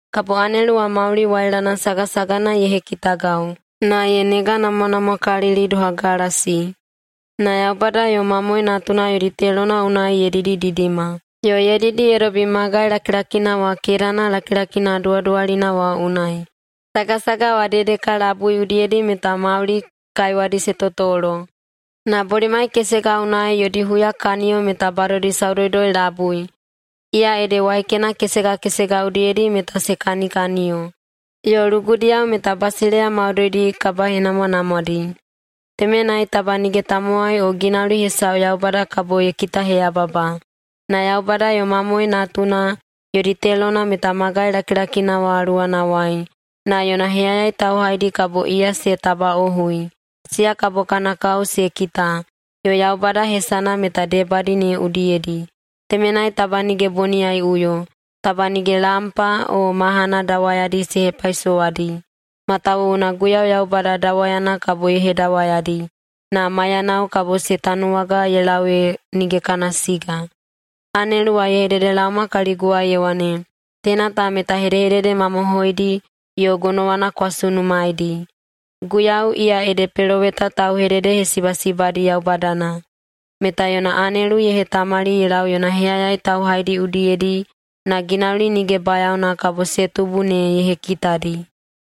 Kabo anelu wa mauli wailana sagasagana ye hekitagau, na ye neganamwanamwakalili doha galasi. Na Yaubada yo Mamoe Natuna yodi telona unai ye didididima, yo ye didi ye dobi magai lakilakina wa kedana lakilakina duwaduwalina wa unai. Sagasaga wa dedeka labui udiyedi meta mauli kaiwadi se totolo, na bolimai kesega unai yodi huyakaniyo meta badodi saudoudoi-labui, iya ede waikena kesega kesega udiyedi meta se kanikaniyo. Yo lugudiyao meta basileiya maudoidi kabahenamwanamwadi. Temenai taba nige tamowai o ginauli hesau Yaubada kabo ye kitaheyababa. Na Yaubada yo Mamoe Natuna yodi telona meta magai lakilakina wa luwanawai, na yona heyayai tauhaidi kabo iya se tabaꞌohui. Siya kabo kana kao se kita, yo Yaubada hesana meta debadi ne udiyedi. Temenai taba nige boniyaiꞌuyo. Taba nige lampa o mahana dawayadi se hepaisowadi, matawuwuna Guiyau Yaubada dawayana kabo ye hedawayadi. Na maiyanao kabo se tanuwaga ye lau ee nige kana siga. Anelu wa ye hededelaoma kaliguwai ye wane, “Teina ta meta hedehedede mamohoidi yo gonowana kwa sunumaedi. Guiyau, iya ede peloweta tauhededehesibasibadi Yaubadana, meta yona anelu ye hetamali ye lau yona heyayai tauhaidi udiyedi na ginauli nige bayaona kabo se tubu ne ye hekitadi.”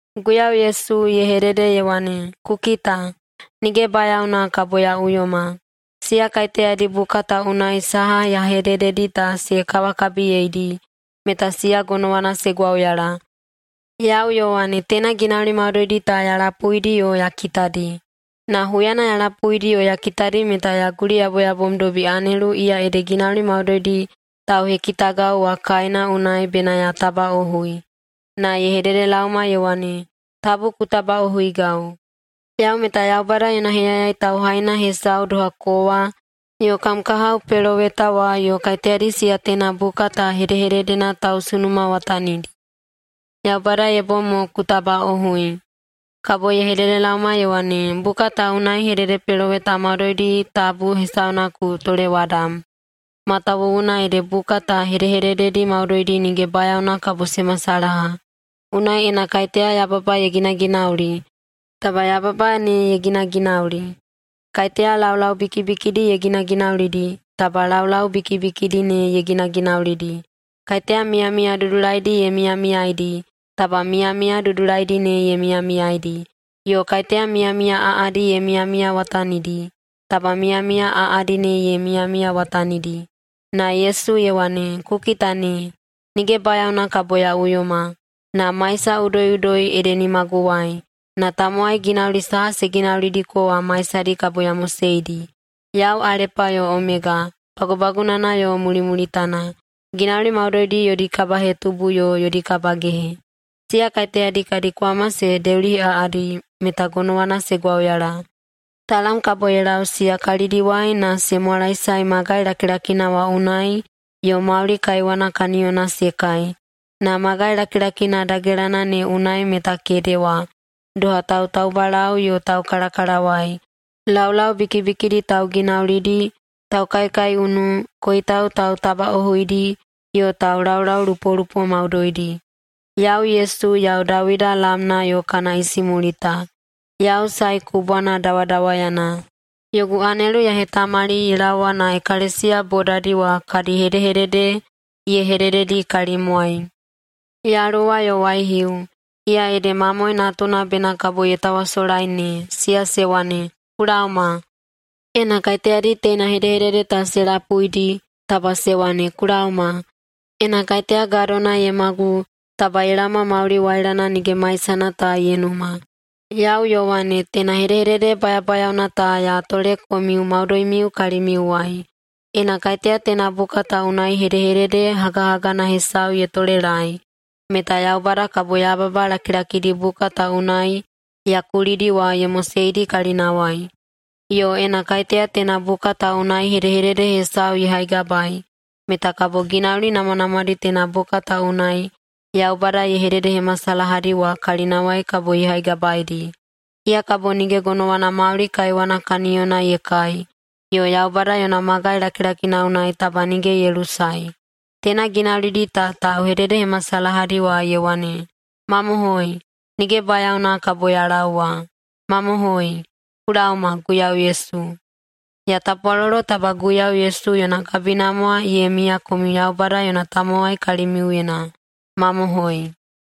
Guiyau Yesu ye hedede ye wane, “Ku kita! Nige bayaona kabo ya uyoma. Siya kaiteyadi buka ta unai saha ya hedededi ta se kawakabiyeidi, meta siya gonowana se gwauyala.” Yau, Yowane, teina ginauli maudoidi ta ya lapuidi yo ya kitadi. Na huyana ya lapuidi yo ya kitadi meta ya guliyaboyabomdobi anelu iya ede ginauli maudoidi tauhekitagau wa kaena unai bena ya tabaꞌohui. Na ye hededelaoma ye wane, “Tabu ku tabaꞌohuigau! Yau meta Yaubada yona heyayai tauhaina hesau doha kowa yo kam kahao peloweta wa yo kaiteyadi siya teina buka ta hedehededena tausunumawatanidi. Yaubada ye bom mo ku tabaꞌohui.” Kabo ye hededelaoma ye wane, “Buka ta unai hededepeloweta maudoidi tabu hesauna ku tolewadam, matawuwuna ede buka ta hedehedededi maudoidi nige bayaona kabo se masalaha. Unai ena kaiteya yababa ye ginaginauli, taba yababa ne ye ginaginauli. Kaiteya laulau bikibikidi ye ginaginaulidi, taba laulau bikibikidi ne ye ginaginaulidi. Kaiteya miyamiya dudulaidi ye miyamiyaidi, taba miyamiya dudulaidi ne ye miyamiyaidi. Yo kaiteya miyamiya aꞌadi ye miyamiyawatanidi, taba miyamiya aꞌadi ne ye miyamiyawatanidi.” Na Yesu ye wane, “Ku kita ne! Nige bayaona kabo ya uyoma. Na maisa udoiꞌudoi ede nimaguwai, na tamowai ginauli saha se ginaulidiko wa maisadi kabo ya moseidi. Yau Alepa yo Omega, Bagubagunana yo Mulimulitana, ginauli maudoidi yodi kabahetubu yo yodi kabagehe. Siya kaiteyadi kadi kwama se deuliheꞌaꞌadi meta gonowana se gwauyala. Talam kabo ye lau siya kalidiwai na se mwalaesae magai lakilakina wa unai yo mauli kaiwana kaniyona se kai. Na magai lakilakina dagelana ne unai meta kedewa, doha tautaubalau yo taukalakalawai, laulau bikibikidi tauginaulidi, taukaikaiunu, koitau tautabaꞌohuidi yo taulaulaulupolupo maudoidi. Yau, Yesu, yau Dawida lamna yo kana isimulita. Yau Sae Kubwana dawadawayana. Yogu anelu ya hetamali ye laowa na ekalesiya bodadi wa kadi hedehedede ye hedededi kalimwai.” Yaluwa yo waihiu, iya ede Mamoe Natuna bena kabo ye tawasolai ne, siya se wane, “Ku laoma!” Ena kaiteyadi teina hedehedede ta se lapuidi, taba se wane, “Ku laoma!” Ena kaiteya gadona ye magu, taba ye laoma mauli wailana nige maisana ta ye numa. Yau, Yowane, teina hedehedede bayabayaona ta ya tole komiu maudoimiu kalimiuwai: Ena kaiteya teina buka ta unai hedehedede hagahagana hesau ye tolelaei, meta Yaubada kabo yababa lakilakidi buka ta unai ya kulidi wa ye moseidi kalinawai. Yo ena kaiteya teina buka ta unai hedehedede hesau ye haigabaei, meta kabo ginauli namwanamwadi teina buka ta unai Yaubada ye hededehemasalahadi wa kalinawai kabo ye haigabaeidi. Iya kabo nige gonowana mauli kaiwana kaniyona ye kai yo Yaubada yona magai lakilakina unai taba nige ye lusae. Teina ginaulidi ta tauhededehemasalahadi wa ye wane, “Mamohoi! Nige bayaona kabo ya laowa.” Mamohoi! Ku laoma, Guiyau Yesu. Ya tapwalolo taba Guiyau Yesu yona kabinamwa ye miya komiu Yaubada yona tamowai kalimiuyena. Mamohoi!